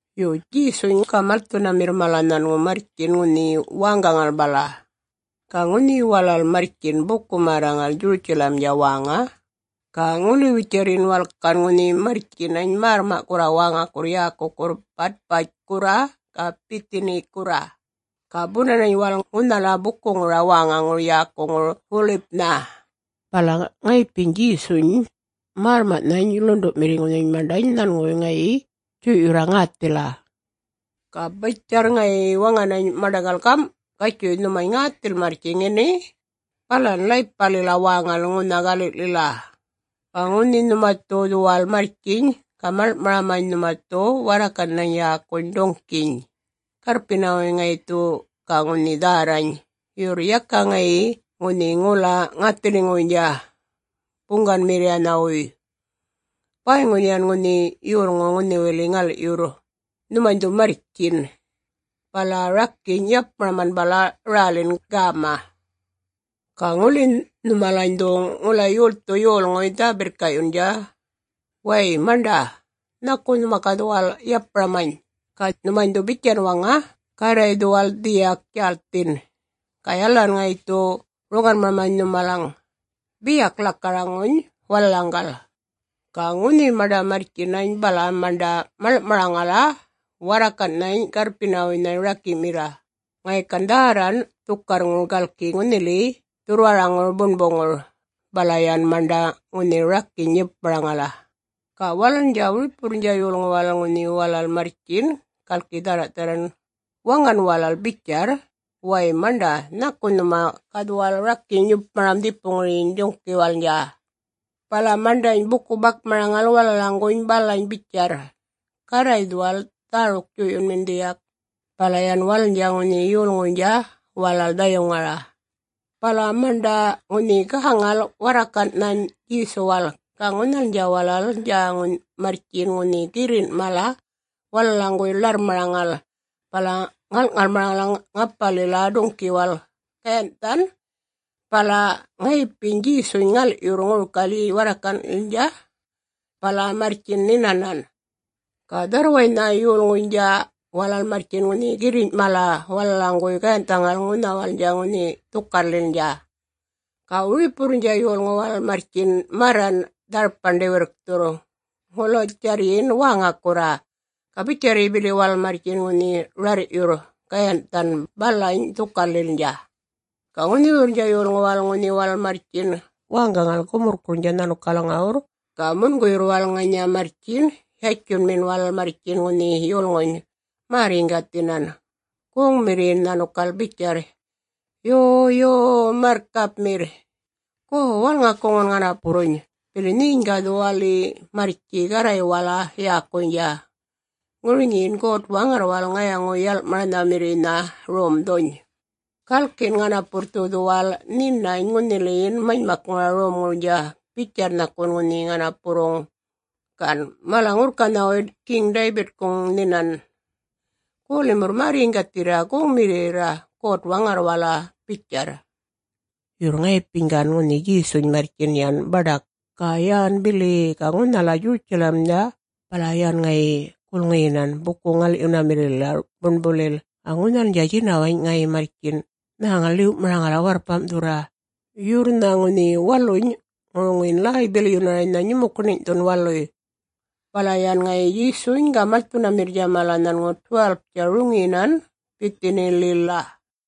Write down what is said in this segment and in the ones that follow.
Yo, Djesuny ga malthunamirrnydja mala nhanŋu marrtjin ŋunhi wäŋgaŋala bala. Ga ŋunhi walal marrtjin bukuy-märraŋal Djurutjalamdja wäŋa. Ga ŋuliwitjarryin walal gan ŋunhi marrtjinany märrma'kurra wäŋakurr yäkukurr Batpatjkurra ga Bithinikurra, ga bunanany walal ŋunhala bukuŋura wäŋaŋur yäkuŋur Wolipnha. Bala ŋayipiny Djesuynydja märrma'nhany ḻundu'mirriŋuny maṉḏany nhanŋuwuy ŋayi djuy'yurra ŋäthila, ga bitjarr ŋayi waŋanany maṉḏaŋgal gam', “Gatjuy nhumany ŋäthil marrtji ŋini, balan ḻaypalila wäŋalil ŋunha gali'lila. Ga ŋunhi nhuma dhu dhuwal marrtjiny, ga maḻŋ'maramany nhuma dhu warrakan'nha yäkuny duŋ'kiny, garrpinawuy ŋayi dhu ga ŋunhi dhärrany. Yurr yaka ŋayi ŋunhi ŋula ŋäthiliŋuwuynydja buŋganmirriyanhawuy; bäyŋu yan ŋunhi yolŋu ŋunhiwili ŋal'yurr. Nhumany dhu marrtjiny, bala rakiny' yapmaraman bala rälin gäma. Ga ŋuli nhumalany dhu ŋula yolthuny yolŋuy dhä-birrka'yundja, ‘Way maṉḏa, nhaku nhuma ga dhuwal yapmaramany?’ Ga nhumany dhu bitjan waŋa, ‘Garray dhuwal dhiyak djälthin, ga yalalan ŋayi dhu roŋanmaramany nhumalaŋ,’ biyak lakaraŋuny walalaŋgal.” Ga ŋunhi maṉḏa marrtjinany, bala maṉḏa maḻŋ'maraŋala warrakan'nhany garrpinawuynha raki'mirra, ŋayi gan dhärran dhukarrŋur, galki ŋunhili dhurrwaraŋur buṉbuŋur. Bala yan maṉḏa ŋunhi rakiny' yupmaraŋala. Ga walalnydja wiripuwurrnydja yolŋu walal ŋunhi walal marrtjin galki dhärra'-dharran, waŋan walal bitjarra, “Way maṉḏa nhaku nhuma ga dhuwal rakiny' yupmaram dhipuŋuryiny duŋ'kiwalnydja.” Bala maṉḏany buku-bakmaraŋal walalaŋguny balany bitjarra, “Garray dhuwal dhäruk djuy'yunmin dhiyak.” Bala yan walalnydja ŋunhi yolŋuynydja walal dhayuŋara. Bala maṉḏa ŋunhi gäŋala warrakan'nhany Djesuwala. Ga ŋunhalnydja walalnydja marrtjin ŋunhi girrin' mala walalaŋguwuy ḻarrmaraŋal, bala ŋal'maraŋala ŋapalila duŋ'kiwala gayanh'than, bala ŋayipiny Djesuny ŋal'yurra ŋurikalyiny warrakan'kalnydja ḏiltjilila, bala marrtjin nhinanan. Ga dharrwaynha yolŋuynydja walal marrtjin ŋunhi girriny' mala walalaŋguwuy gayanh'thaŋala ŋunhawalnydja ŋunhi dhukarrlilnydja. Ga wiripuwurruynydja yolŋuy walal marrtjin marran dharpan ḏiwirrkthurr, ŋulatjarryin wäŋakurra, ga bitjarryi bili walal marrtjin ŋunhi rarr'yurr gayanh'thany balany dhukarrlilnydja. Ga ŋunhiwurrnydja yolŋu walal ŋunhi walal marrtjin wäŋgaŋal gumurrkurrnydja nhanukalaŋuwurr, ga munguyurr walal ŋanya marrtjin, yatjunminan walal marrtjin ŋunhi yulŋuny, märr-yiŋgathinan, goŋmirriyinan nhanukal bitjarra, “Yo, yo-o-o Marrkapmirr! Go walŋakuŋun ŋanapurruny. Bili nheny ga dhuwali marrtji Garraywala yäkuynydja, ŋuriŋin God-Waŋarrwala ŋayaŋu-yal'maranhamirriynha romdhuny. Galkin ŋanapurr dhu dhuwal nhinany ŋunhiliyin manymakŋura romŋurnydja, bitjarr nhakun ŋunhi ŋanapurruŋ gan mala-ŋurrkanhayŋu Geŋ-Daybit nhinan. Go limurr märr-yiŋgathirra, goŋmirriyirra God-Waŋarrwala,” bitjarr. Yurr ŋayipiny gan ŋunhi Djesuny marrtjin yan baḏak, ga yan bili, ga ŋunhala Djurutjalamnha bala yan ŋayi gulŋiyinan buku-ŋal'yunamirrilila buṉbulil. Ga ŋunhalnydja ŋunhi djinawany' ŋayi marrtjin nhäŋala ḻiw'maraŋala warrpam'thurra. Yurr ŋunhi waluynydja ŋuruŋun ḻäy-bilyunaraynha nyumukuṉiny'thun waluy. Bala yan ŋayi Djesuny ga malthunamirrnydja mala nhanŋu 12-tja roŋiyinan Bithinilila.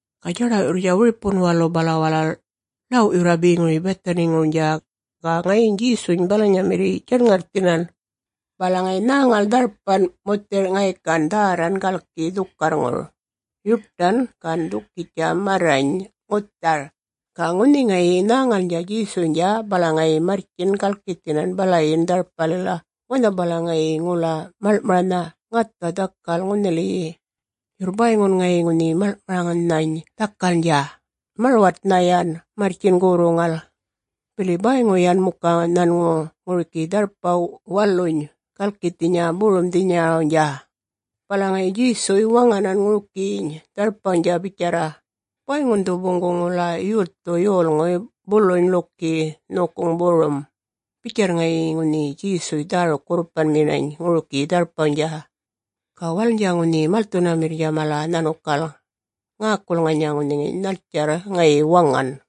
Ga djaḏaw'yurr wiripun walu, bala walal ḻaw'yurra beŋuryiny Bithiniŋurnydja, ga ŋayiny Djesuny balanyamirriy djaṉŋarrthinan. Bala ŋayi nhäŋala dharpan muthir'nha ŋayi gan dhärran galki dhukarrŋur; yuṯan gan ḏukitjtja marrany ŋuthar, ga ŋunhi ŋayi nhäŋalnydja Djesuynydja, bala ŋayi marrtjin galkithinan balayin dharpalila wanha balaŋ ŋayi ŋula maḻŋ'maranha ŋatha dhakal ŋunhiwiliyi. Yurr bäyŋun ŋayi ŋunhi maḻŋ'maranhany dhakalnydja, marwatnha yan marrtjin gorruŋal, bili bäyŋu yan muka nhanŋu ŋurikiny dharpaw waluny galkithinya borumdhinyarawnydja. Bala ŋayi Djesuny waŋanan ŋurikiyiny dharpawnydja bitjarra, “Bäyŋun dhu boŋguŋ ŋula yolthuny yolŋuy buluny ḻuki nhokuŋuny borum.” Bitjarra ŋayi ŋunhi Djesu dhäruk-gurrupanminany ŋurikiyi dharpawnydja. Ga walalnydja ŋunhi malthunamirriynydja mala nhanukal ŋäkul ŋanya ŋunhi nhaltjarr ŋayi waŋan.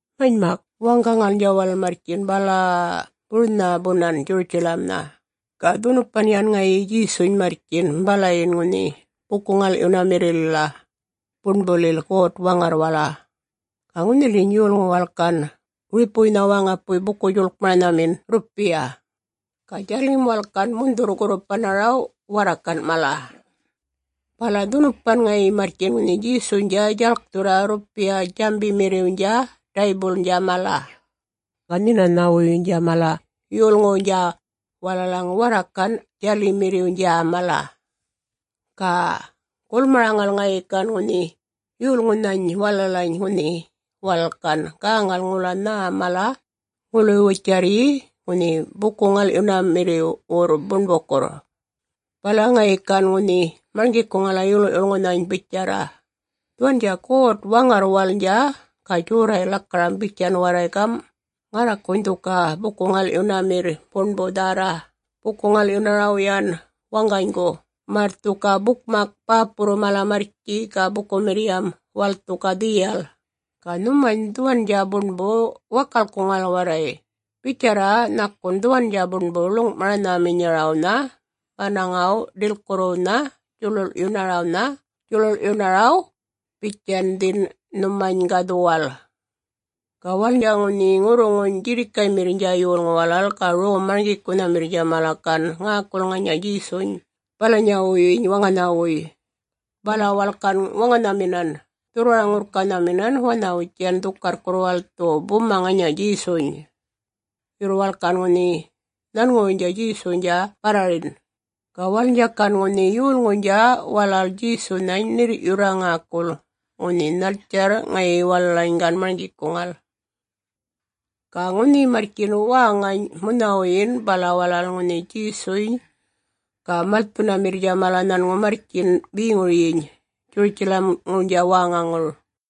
Manymak, wäŋgaŋalnydja walal marrtjin bala-a-a-a burnha bunan Djurutjalamnha, Ga dhunupan yan ŋayiny Djesuny marrtjinan balayin ŋunhi buku-ŋal'yunamirrilila Buṉbulil God-Waŋarrwala. Ga ŋunhiliyi yolŋu walal gan wiripuŋuwuy wäŋapuy buku-djuḻkmaranhamin rrupiya, ga djalim walal gan mundhurr-gurrupanaraw warrakan' mala. Bala dhunupan ŋayi marrtjin ŋunhi Djesuynydja djalkthurra rrupiya-djambimirriwnydja daybuḻnydja mala, ga nhinanhawuynydja mala yolŋuwnydja walalaŋ warrakan' djalimmirriwnydja mala. Ga gulmaraŋala ŋayi gan ŋunhi yolŋunhany walalany ŋunhi walal gan gäŋal ŋula nhä mala ŋuliwitjarryi ŋunhi buku-ŋal'yunamirriwurr buṉbukurr. Bala ŋayi gan ŋunhi marŋgikuŋala yolŋu'-yulŋunhany bitjarra, “Dhuwandja God-Waŋarrwalnydja ga djorray' lakaram bitjan warray gam', ‘Ŋarrakuny dhu ga buku-ŋal'yunamirr buṉbu dhärra buku-ŋal'yunaraw yan waŋganygu, märr dhu ga bukmak bäpurru mala marrtji ga bukumirriyam walal dhu ga dhiyal.’ Ga nhumany dhuwandja buṉbuny wakalkuŋal warray, bitjarra nhakun dhuwandja buṉbu ḻuŋ'maranhaminyarawnha manaŋa-ḏilkurruwnha djuḻuḻ'yunaraw, bitjandhin nhumany ga dhuwal.” Ga walalnydja ŋunhi ŋurruŋu djirrikaymirriynydja yolŋuy walal ga rom-marŋgikunhamirriynydja mala gan ŋäkula ŋanya Djesuny balanyawuyyiny waŋanhawuy, bala walal gan waŋanhaminan dhurrwara-ŋurrkanhaminan wanhawitjan dhukarrkurr walal dhu buma ŋanya Djesuny. Yurr walal gan ŋunhi nhanŋuwuynydja Djesuwnydja barrarin. Ga walalnydja gan ŋunhi yolŋuynydja walal Djesunhany ṉirr'yurra ŋäkul ŋunhi nhaltjarr ŋayi walalany gan marŋgikuŋal. Ga ŋunhi marrtjin wäŋany munhawuyin, bala walal ŋunhi Djesuny ga malthunamirrnydja mala nhanŋu marrtjinan beŋuryiny Djurutjalamŋurnydja wäŋaŋur.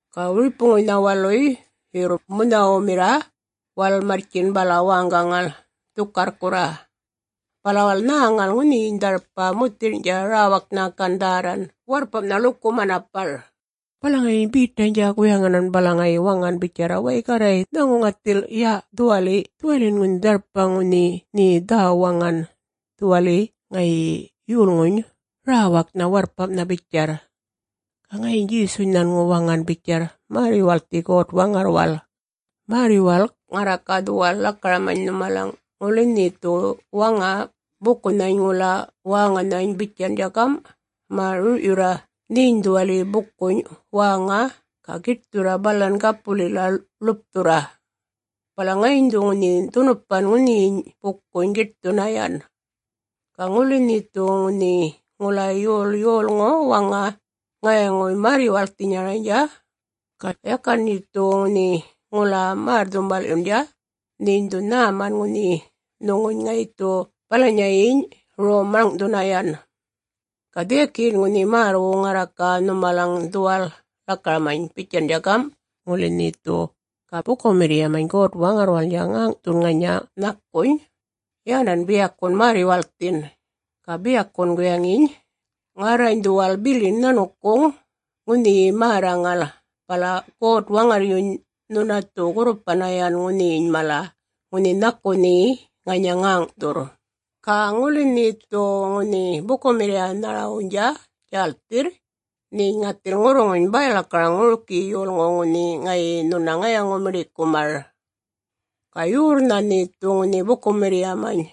Ga wiripuŋuynha waluy, yurr munhawumirra, walal marrtjin bala wäŋgaŋala, dhukarrkurra. Bala walal nhäŋala ŋunhiyiny dharpa muthirny'tja räwaknha gan dhärran warrpam'nha ḻuku manapara. Bala ŋayi Betaynydja guyaŋanan, bala ŋayi waŋanan bitjarra, “Way Garray nhäŋu ŋathil ya-dhuwali, dhuwaliyin ŋunhi dharpany ŋunhi nhe dhä-waŋa, dhuwaliyin ŋayi yulŋuny räwaknha warrpam'nha,” bitjarr. Ga ŋayiny Djesuny nhanŋu waŋan bitjarr, “Märr-yuwalkthi God-Waŋarrwal. Märr-yuwalk ŋarra ga dhuwal lakaramany nhumalaŋ, ŋuli nhe dhu waŋa bukunhany ŋula wäŋanhany bitjandja gam', ‘Ma! rur'yurra nheny dhuwaliyiny bukuny wäŋa ga giṯthurra balan gapulila ḻupthurra,’ bala ŋayiny dhu ŋunhi dhunupan ŋunhiyiny bukuny giṯthunna yan. Ga ŋuli nhe dhu ŋunhi ŋula yol yolŋu waŋa ŋayaŋuy märr-yuwalkthinyaraynydja, ga yakan nhe dhu ŋunhi ŋula märr-dhumbal'yundja, nheny dhu nhäman ŋunhi nhuŋuny ŋayi dhu balanyayiny rom maḻŋ'thunna yan. Ga dhiyakiyin ŋunhi märrwu ŋarra ga nhumalaŋgal dhuwal lakaramany bitjandja gam', ŋuli nhe dhu ga bukumirriyamany God-Waŋarrwalnydja ŋäŋ'thundja ŋanya ŋula nhakuny, yanan biyakun märr-yuwalkthin, ga biyakun guyaŋiny ‘Ŋarrany dhuwal bilin nhanukuŋ ŋunhiyiny märraŋala,’ bala God-Waŋarryuny nhuna dhu gurrupanna yan ŋunhiny mala ŋunhi nhaku nhe ŋanya ŋäŋ'thurr.” “Ga ŋuli nhe dhu ŋunhi bukumirriyanharawnydja djälthirr, nheny ŋathil ŋurruŋuny bäy-lakaraŋ ŋurikiyi yolŋuw ŋunhi ŋayi nhuna ŋayaŋu-miḏikumar, ga yorrnha nhe dhu ŋunhi bukumirriyamany,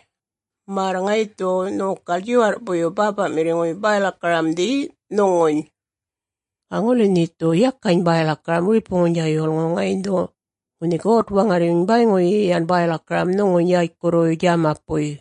märr ŋayi dhu nhokal djiwarr'puyyuny Bäpa'mirriŋuy bäy-lakaramdhi nhuŋuny. Ga ŋuli nhe dhu ŋunhi yakany bäy-lakaram wiripuŋuwnydja yolŋuw, ŋayiny dhu ŋunhi God-Waŋarryuny bäyŋuyi yan bäy-lakaram nhuŋuny yätjkurruwuy djämapuy.”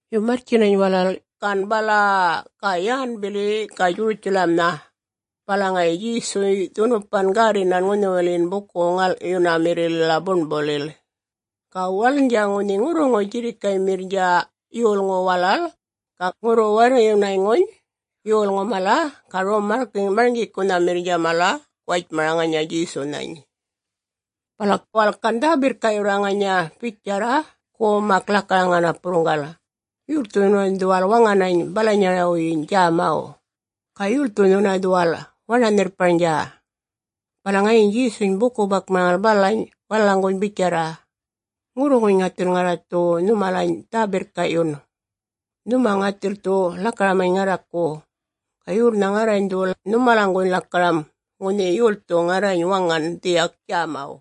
Yo marrtjinany walal gan bala-a-a, ga yan bili ga Djurutjalamnha, bala ŋayi Djesuny dhunupan gärrinan ŋunhiwiliyin buku-ŋal'yunamirrilila buṉbulil. Ga walalnydja ŋunhi ŋurruŋu djirrikaymirrnydja yolŋu walal ga ŋurru-warryunayŋuny yolŋu mala ga rom-marŋgikunhamirriynydja mala, guwatjmara ŋanya Djesunhany. Bala walal gan dhä-birrka'yurra ŋanya bitjarra, “Go mak lakaraŋ napurruŋgal, … yolthu nhuna dhuwal waŋanany balanyarawyiny djämaw? Ga yolthu nhuna dhuwal waṉa-nhirrparnydja?” Bala ŋayiny Djesuny buku-bakmaraŋal balany walalaŋguny bitjarra, “Ŋurruŋuny ŋathil ŋarra dhu nhumalany dhä-birrka'yun. Nhuma ŋathil dhu lakaramany ŋarraku, ga yorrnha ŋarrany dhu nhumalaŋ lakaram ŋunhi yolthu ŋarrany waŋan dhiyak djamaw.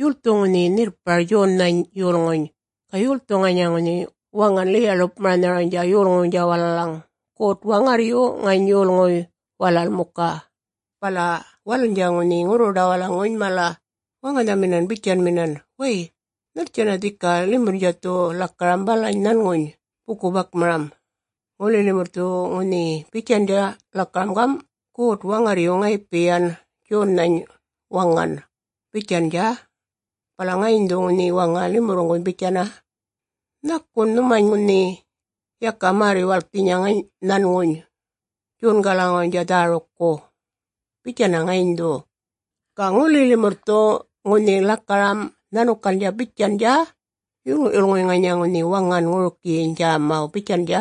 Yolthu ŋunhi nhirrpar Djonnhany yolŋuny? Ga yolthu ŋanya ŋunhi waŋan ḻiya-ḻupmaranharaw yolŋuwnydja walalaŋ? God-Waŋarryu? Ŋany yolŋuy walal muka?” Bala walalnydja ŋunhi ŋurruḏawalaŋuny mala waŋanhaminan bitjanminan, “Way, nhaltjanna dhika limurrnydja dhu lakaram balany nhanŋuny buku-bakmaram? Ŋuli limurr dhu ŋunhi bitjandja lakaram gam', ‘God-Waŋarryu ŋayipi yan Djonnhany waŋan,’ bitjandja, bala ŋayiny dhu ŋunhi waŋa limurruny bitjanna, ‘Nhakun nhumany ŋunhi yakany märr-yuwalkthinya nhanŋuny Djongalaŋuwnydja dhärukku?’ bitjanna ŋayiny dhu. Ga ŋuli limurr dhu ŋunhi lakaram nhanukal bitjandja, ‘Yolŋu'-yulŋuy ŋanya ŋunhi waŋan ŋurikiyiny djämaw,’ bitjandja,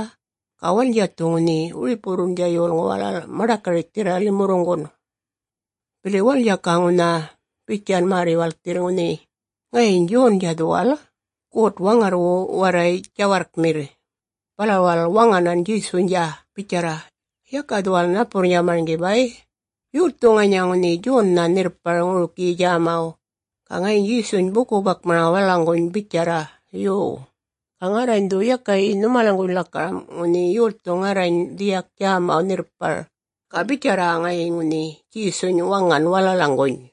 ga walalnydja dhu ŋunhi wiripuwurrnydja yolŋu walal maḏakarritjthirra limurruŋgun. Bili walalnydja ga ŋunha bitjan märr-yuwalkthirr ŋunhi ŋayiny Djondja dhuwal God-Waŋarrwu warray djawarrkmirr.” Bala walal waŋanan Djesuwnydja bitjarra, “Yaka dhuwal napurrnydja marŋgi bay, yolthu ŋanya ŋunhi Djonnha nhirrpar ŋurikiyiny djämaw.” Ga ŋayiny Djesuny buku-bakmaraŋal walalaŋguny bitjarra, “Yo. Ga ŋarrany dhu yakayi nhumalaŋguny lakaram, ŋunhi yolthu ŋarrany dhiyak djämaw nhirrpar.” Ga bitjarra ŋayi ŋunhi Djesuny waŋan walalaŋguny.